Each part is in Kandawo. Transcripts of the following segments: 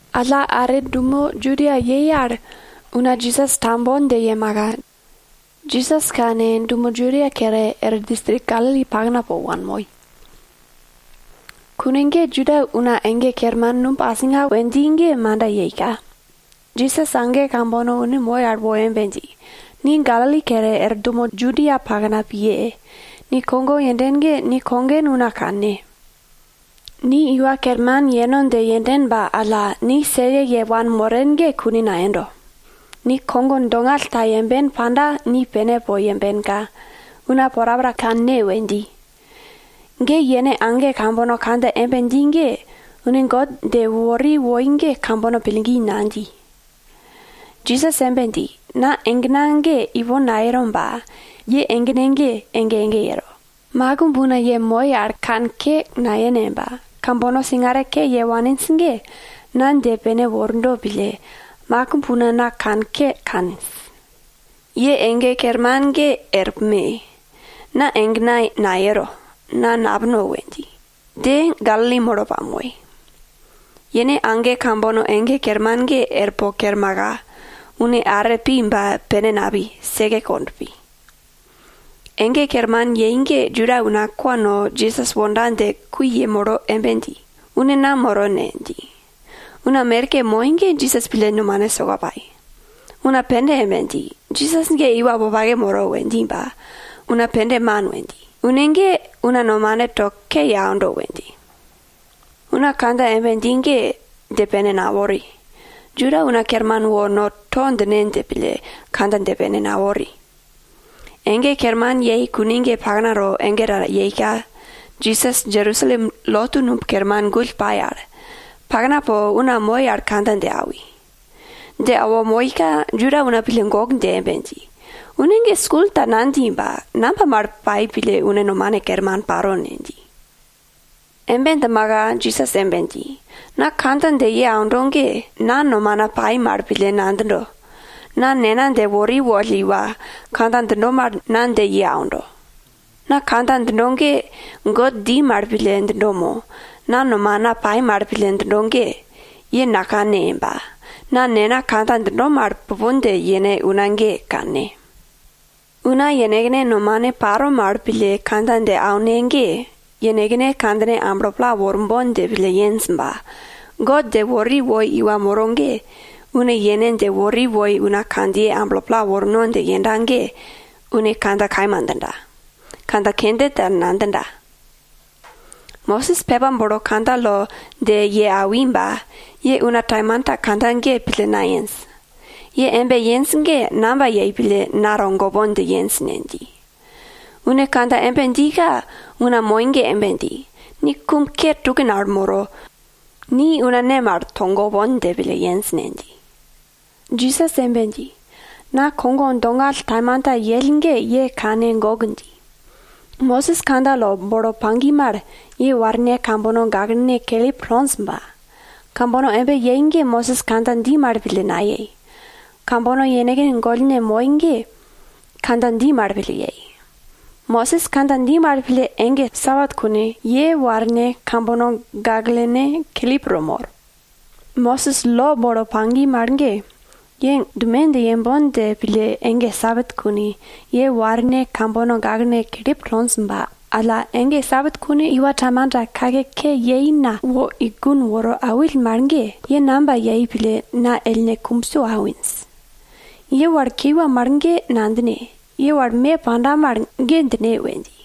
Alla are dumo Judia yei al, Juda una Jisas tambon dje yemaka, Jisas kane, dumo Judia kere, er distrik Galili pakna po wanmoi. Kune ge Juda una ege kerman Numb Asinga we dji ge manda yeika, Jisas age kambono une moi al wo embe dji, ni Galili kere er dumo Judia pakna piye! Ni kogo yenden ge ni kogen una kanne. Ni iwa kerman yeno dje yenden ba alla, ni seke ye wanmoren ge kune nayendo. Ni kogo dongall ta yemben panda, ni pene po yembenka, una porapora kanne we dji. Ge yene age kambono kandja embe dji ge, une God dje wori woi ge kambono pillgi nadji. Jisas embe dji, na egena ge ipon nayero ba, ye egene ge ege ege yero. Makimb una ye moye al kanke nayene ba, kambono singare ke ye waninj ge, na dje pene wordo pille, makimb una na kanke kaninj. Ye ege kerman ge er pume! Na egena nayero, na napuno we dji. Dje, Galili molo pamoi. Yene age kambono ege kerman ge er po kermaka, une are pi ba, pene napi, seke kond pi. Ege kerman yei ge Juda una kwa no Jisas wonda dje kui yemolo embe dji, une nam moro ne? dji. Una merke moi ge Jisas pille nomane soka pai. Una pende embe dji, Jisas ge iwa wopake moro we dji ba, una pende man we dji. Une ge una nomane to ke ye aundo we dji. Una kandja embe dji ge, dje pene nawori, Juda una kerman wo no to djine dje pille, kandja dje pene nawori. Ege kerman yei kune ge paknato ege ta yeika, Jisas Jerusalem lotu numb kerman gull pai al, pakna po una moi al kandja dje awi. Dje awo moika, Juda una pille gok dje embe dji, une ge skul ta nadji ba, namba mal pai pille une nomane kerman paro ne? dji. Embe djimaka Jisas embe dji, na kandja dje ye aundo ge, na nomana pai mal pille nadjindo, na Nena dje wori woll iwa, kandja djindo mal na dje ye aundo. Na kandja djindo ge God dji mal pille djindo mo, mo na nomana pai mal pille djindo ge, ye nakanne ba, na Nena kandja djindo mal, pupon dje yene una ge, kanne. Una yenekne nomane paro mal pille kandja dje aune ge, yenekne kandjine amblo pla worbon dje pille yenj ba, God dje wori woi iwa moro ge, une yene dje wori woi una kandjiye amblo pla worno dje yenda ge, une kandja kaima djinda, kandja kende ta nadjinda. Mosis pepa bolo kandja lo dje ye awi ba, ye una taimanta kandja ge pille nayenj. Ye embe yenj ge, namba yei pille na togopon dje yenj ne? dji. Une kandja embe djika, una moi ge embe dji, ni kum ke tukin al moro, una ne mal ni togopon dje pille yenj ne? dji. Jisas embe dji, na kogo dongall taimanta yell ge ye kane gok dji. Mosis kandja lo bolo pagi mal, ye warne kambono gaklene kelip tonj ba, kambono embe yei ge Mosis kandja dji mal pille nayei, kambono yenekne gollne moi ge kandja dji mal pille yei. Mosis kandja dji mal pille ege Sabat kune ye warne kambono gaklene kelip to mor. Mosis lo bolo pagi mal ge, ye dume dje yembon dje pille ege Sabat kune, ye warne kambono gaklene kelip tonj ba alla, ege Sabat kune iwa taimanta kake ke yei na wo i gun woro awill mal ge, ye namba yei pille na ellne kumbso awinj? Ye wal kiwa mal ge nadjine, ye wal me panda mal, ge djine we dji.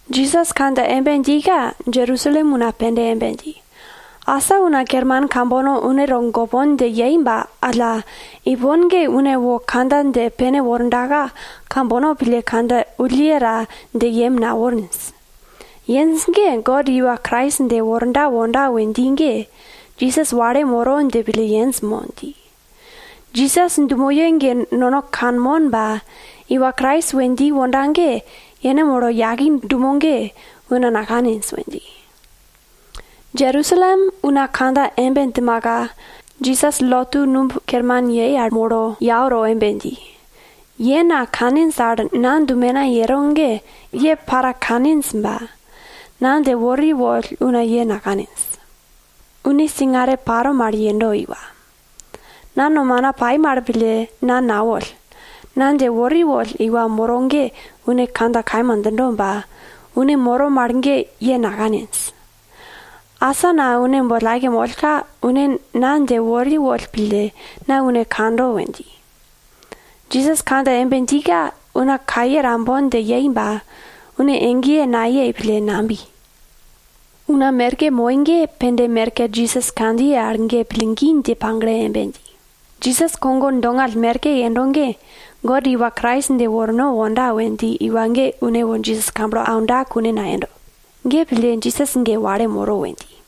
Jisas kandja embe djika Jerusalem una pende embe dji, asa una kerman kambono une togopon dje yei ba alla, ipon ge une wo kandja dje pene wordaka, kambono pille kandja wulle ta dje yem naworinj. Yenj ge, God iwa Krais dje worda wonda we dji ge, Jisas wale moro dje pille yenj mo? dji. Jisas dumoye ge nono kanmon ba, iwa Krais we dji wonda ge, yene molo yaki dumo ge, una nakaninj we dji. Jerusalem una kandja embe djimaka, Jisas lotu numb kerman yei al molo yau to embe dji, ye na kaninj al na dumena yero ge ye para kaninj ba, na dje wori woll una ye nakaninj. Une singare paro mal yendo iwa. Na nomana pai mal pille na nawoll, na dje wori woll iwa moro ge une kandja kaima djindo ba, une moro mal ge ye nakaninj. Asa na une boll aike mollka, une na dje wori woll pille, na une kando we dji. Jisas kandja embe djika, una kaye tambon dje yei ba, une egeye nayei pille, nabi. Una merke moi ge, pende merke Jisas kandjiye al ge pillgi dje pagle embe dji, Jisas kogo dongall merke yendo ge, God iwa Krais dje worno wonda we dji iwa ge une wo Jisas kamblo aunda kune nayendo. Ge pille, Jisas ge wale moro we dji.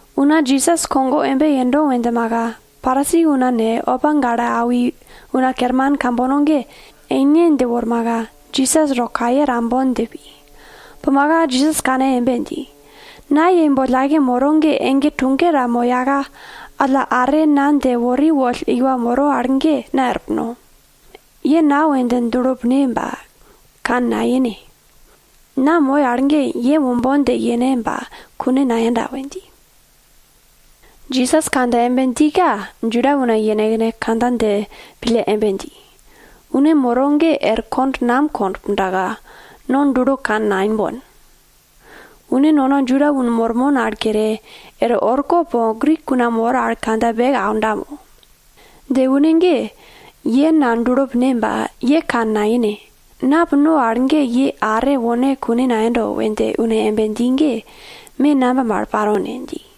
Una Jisas kogo embe yendo we djimaka, Parisi una ne, opa gale awi una kerman kambono ge eine dje wormaka, Jisas to kaye tambon dje pi. Pumaka Jisas kane embe dji, na ye boll aike moro ge ege tuge ta moyaka, alla are na dje wori woll iwa moro al ge na er puno. Ye na we dje dulo pine ba, kane naine. Na moyo al ge ye wombon dje yene ba kune nayenda we dji. Jisas kandja embe djika, Juda una yenekne kandja dje pille embe dji, une moro ge er kond nam kond pundaka, nono dulo kane naimbon? Une nono Juda una mormon al kere, er orko po Grik una mor al kandja beke auno dje pille djindo mo? Ye na dulo pine ba, ye kane naine, na puno al ge ye are wone kune nayendo we dje une embe dji ge, me namba mal paro ne? dji.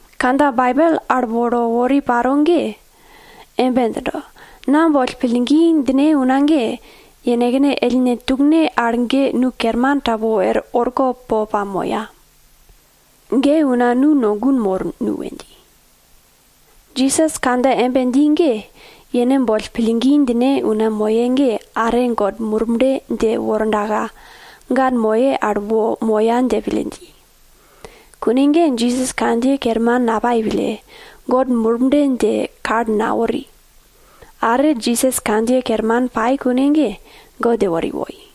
Kandja Baibel al bolo wori paro ge embe djindo, na boll pillgi djine una ge, yenekne ellne tukene al ge nu dal yage wor orko po pamoya. Ge una nu no gun mor nu we dji. Jisas kandja embe dji ge, yene boll pillgi djine una moye ge are God Murble dje wordaka, ga moye al wo moya dje pille dji. Kune ge Jisas kandjiye kerman napai pille, God Murble dje kal nawori. Are Jisas kandjiye kerman pai kune ge, God dje wori woi.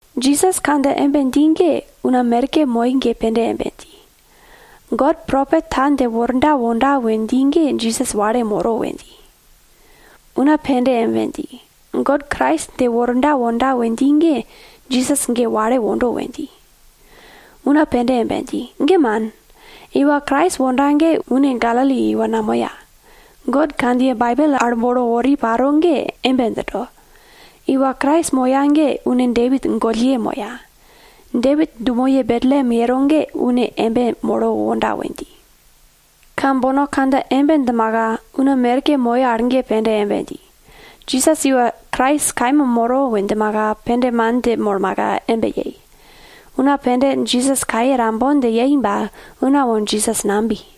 Jisas kandja embe dji ge una merke moi ge pende embe dji, God propet ta dje worda wonda we dji ge Jisas wale moro we dji. Una pende embe dji, God Krais dje worda wonda we dji ge Jisas ge wale wondo we dji. Una pende embe dji, ge man, iwa Krais wonda ge une Galili iwa namoya God kandjiye Baibel al bolo wori paro ge embe djindo, iwa Krais moya ge une Depit gollye moya, Depit dumoye Betlem yero al ge une molo wonda we dji. Kambono kandja embe djimaka, una merke moi al ge pende embe dji, Jisas iwa Krais kaima moro we djimaka, pende man dje molmaka embe yei. Una pende Jisas kaye tambon dje yei ba, una wo Jisas nabi.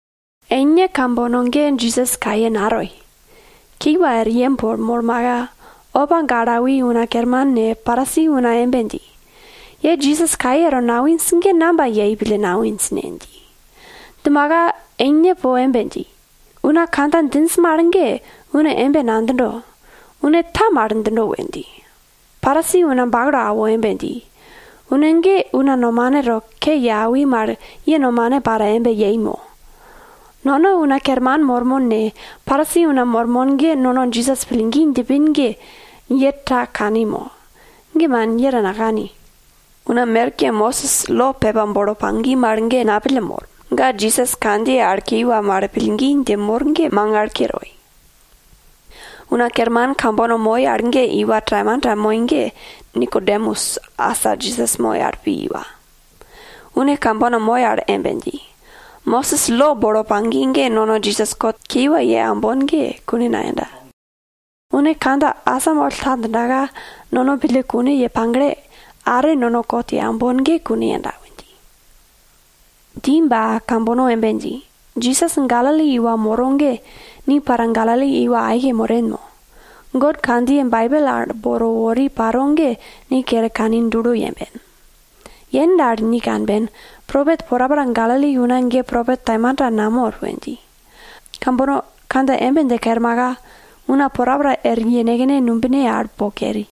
Eine kambono ge Jisas kaye natoi, kiwa er yem po molmaka, opa gale awi una kerman ne, Parisi una embe dji, ye Jisas kaye to naiwinj ge namba yei pille to naiwinj ne? dji. Djimaka eine po embe dji, una kandja djinj mal ge, une embe nadjindo, une ta mal djindo we dji. Parisi una bakalo awo embe dji, une ge una nomane to ke ye aundo mal, ye nomane para embe yendo mo? Nono una kerman mormon ne, Parisi una mormon ge nono Jisas pillgi djipin ge ye ta kani mo? Ge man, ye ta nakani! Una merke Mosis lo pepa bolo pagi mal ge napille mor. Ga Jisas kandjiye al kiwa mal pillgi dje mor dje mangal ke toi. Una kerman kambono moi al ge iwa taimanta moi ge Nikodemus asa Jisas moi al pi iwa. Une kambono moi al embe dji, Mosis lo bolo pagi ge, nono Jisas kot kiwa ye aumbon ge, kune nayenda. Une kandja asamoll ta djindaka, nono pille kune ye pagle, are nono kot ye aumbon ge kune yenda we dji. Dji ba kambono embe dji, Jisas Galili iwa moro ge, ni para Galili iwa aike moren mo? God kandjiye Baibel al bolo wori paro ge ni kere kane yemben. Yen dal, ni kanben, propet porapora Galili una ge propet taimanta namor we dji. Kambono kandja embe dje kermaka, una porapora er yenekne numbine al po keri.